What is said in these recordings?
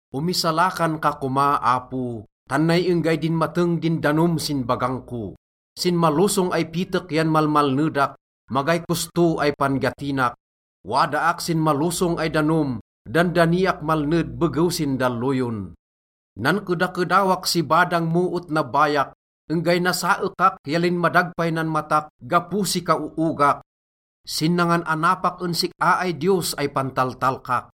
Omisalakan ka koma, Apo, tan nay enggay dinmateng din danom sin bagang ko. Sin malosong ay pitek yan malmalnedak, magay kosto ay pan-gatinak. Wadaak sin malosong ay danom, dandaniak malned begew sin dalloyon. Nankedakedawak si badang mo et nabbayak, enggay nasaekak ya linmadag pay nan matak gapo si kaoogak sin nangan-anapak en sik-a ay Diyos ay pantaltalkak.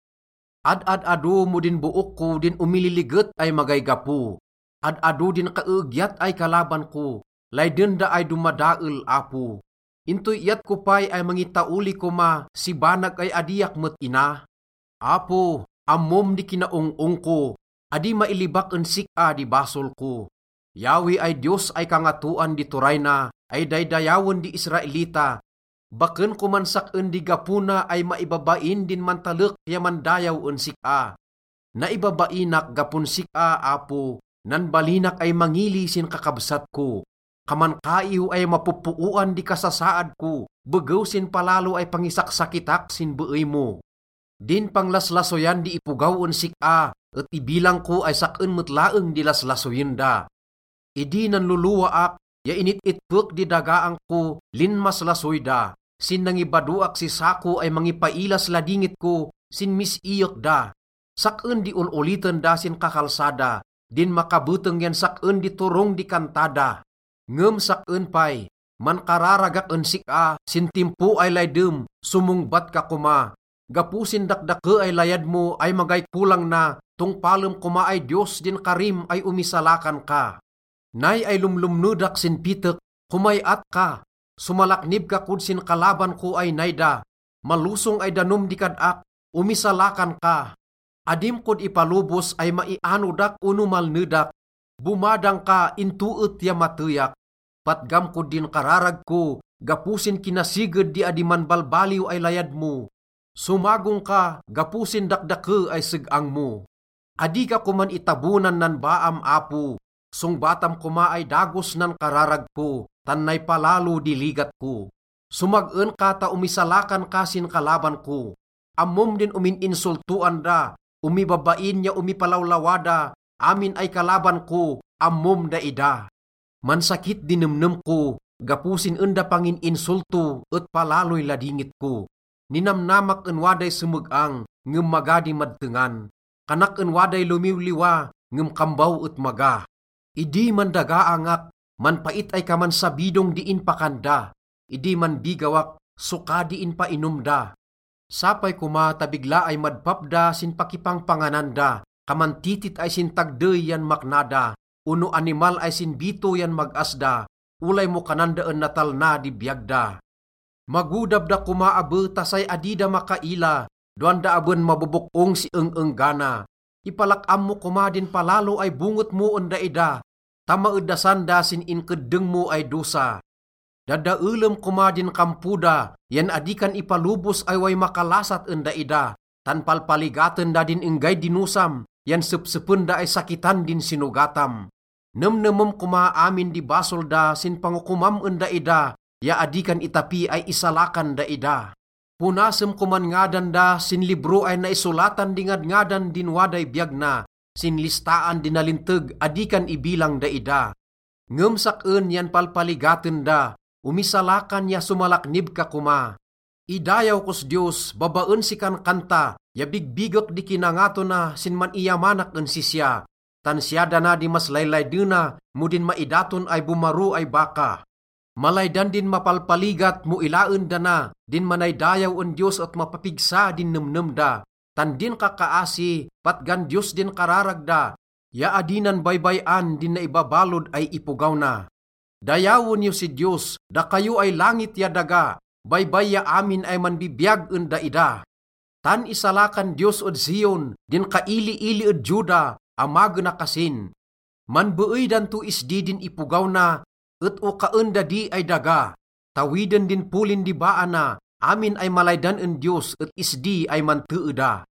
Ad-ad-ado mo din book ko din omililiget ay magay gapo. Ad-ado din kaeegyat ay kalaban ko, layden da ay domadael, Apo. Intoy iyat ko pay ay mangitaoli koma si banag ay adiak met ina? Apo, ammom di kinaong-ong ko, adi mailibak en sik-a di basol ko. Yahweh ay Diyos ay Kangatoan di Turay na ay daydayawen di Israelita, baken koman sak-en di gapo na ay maibabain din mantalek ya mandayaw en sik-a. Naibabainak gapon sik-a, Apo. Nanbalinak ay mangili sin kakabsat ko. Kaman kaiw ay mapoppooan di kasasaad ko begew sin palalo ay pangisaksakitak sin beey mo. Din panglaslasoyan di ipogaw en sik-a et ibilang ko ay sak-en met laeng di laslasoyen da. Idi nanlolowaak ya init-itpek di dagaang ko, linmaslasoy da. Sin nangibadoak si sako ay mangipailas ladingit ko, sinmis-iyek da. Sak-en di ol-oliten da sin kakalsada, din makabeteng yan sak-en di turong di kanta da. Ngem sak-en pay, mankararagak en sik-a, sin timpo ay laydem, somongbat ka koma. Gapo sin dakdake ay layad mo ay magay kolang na, tongpalem koma ay Diyos din karim ay omisalakan ka. Nay ay lomlomnedak sin pitek. Komay-at ka! Somalaknib ka kod sin kalaban ko ay nay da. Malosong ay danom di kad-ak, omisalakan ka! Adim kod ipalobos ay maianodak ono malnedak, bomadang ka into et ya mateyak. Patgam kod din kararag ko gapo sin kinasiged di adi manbalbaliw ay layad mo, somagong ka gapo sin dakdake ay seg-ang mo. Adi ka koman itabonan nan baam, Apo, songbatam koma ay dagos nan kararag ko, tan nay palalo di ligat ko. Somag-en ka ta omisalakan ka sin kalaban ko. Ammom din omin-insoltoan da, omibabain ya omipalawlawa da, amin ay kalaban ko, ammom daida. Mansakit di nemnem ko gapo sin en da pangin-insolto et palaloy ladingit ko. Ninamnamak en waday someg-ang, ngem maga di madtengan. Kanak en waday lomiwliwa, ngem kambaw et maga. Idi mandagaangak, manpait ay kaman sabidong di inpakan da, idi manbigawak, soka di inpainom da. Sapay koma ta bigla ay madpap da sin pakipangpanganan da, kaman titit ay sin tagdey yan makna da ono animal ay sin bito yan mag-as da olay mo kanan da en natalna di biyag da. Magodab da koma abe ta say adi da makaila dowan da aben mabobok-ong si eng-enggana. Ipalak-am mo koma din palalo ay bonget mo en daida ta maedasan da sin inkeddeng mo ay dosa. Dadaelem koma din kampo da yan adi kan ipalobos ay way makalasat en daida. Tan palpaligaten da din enggay dinosam, yan sepsepen da ay sakitan din sinogatam. Nemnemem koma amin di basol da sin pangokomam en daida ya adi kan itapi ay isalakan daida. Ponasem koman ngadan da sin libro ay naisolatan di ngadngadan din waday biyag na, sin listaan di nalinteg adi kan ibilang daida. Ngem sak-en yan palpaligaten da, omisalakan ya somalaknib ka koma. Idayaw kos Diyos babaen si kankanta ya bigbigek di kinangato na sin man-iyamanak en sisya. Tan siya dana di mas laylaydena mo din maidaton ay bomaro ay baka. Malaydan din mapalpaligat mo ilaen da na, din manaydayaw en Diyos et mapapigsa din nemnem da. Tan din kakkaasi, patgan Diyos din kararag da, ya adi nan baybay-an din naibabalod ay ipogaw na. Dayawen yo si Diyos, dakayo ay langit ya daga, baybay ya amin ay manbibiyag en daida. Tan isalakan Diyos ed Zion, din kailiili ed Juda, amagena kasin. Manbeey dan to isdi din ipogaw na et okaen da di ay daga. Tawiden din polin di baa na, amin ay malaydan en Diyos et isdi ay mantee da.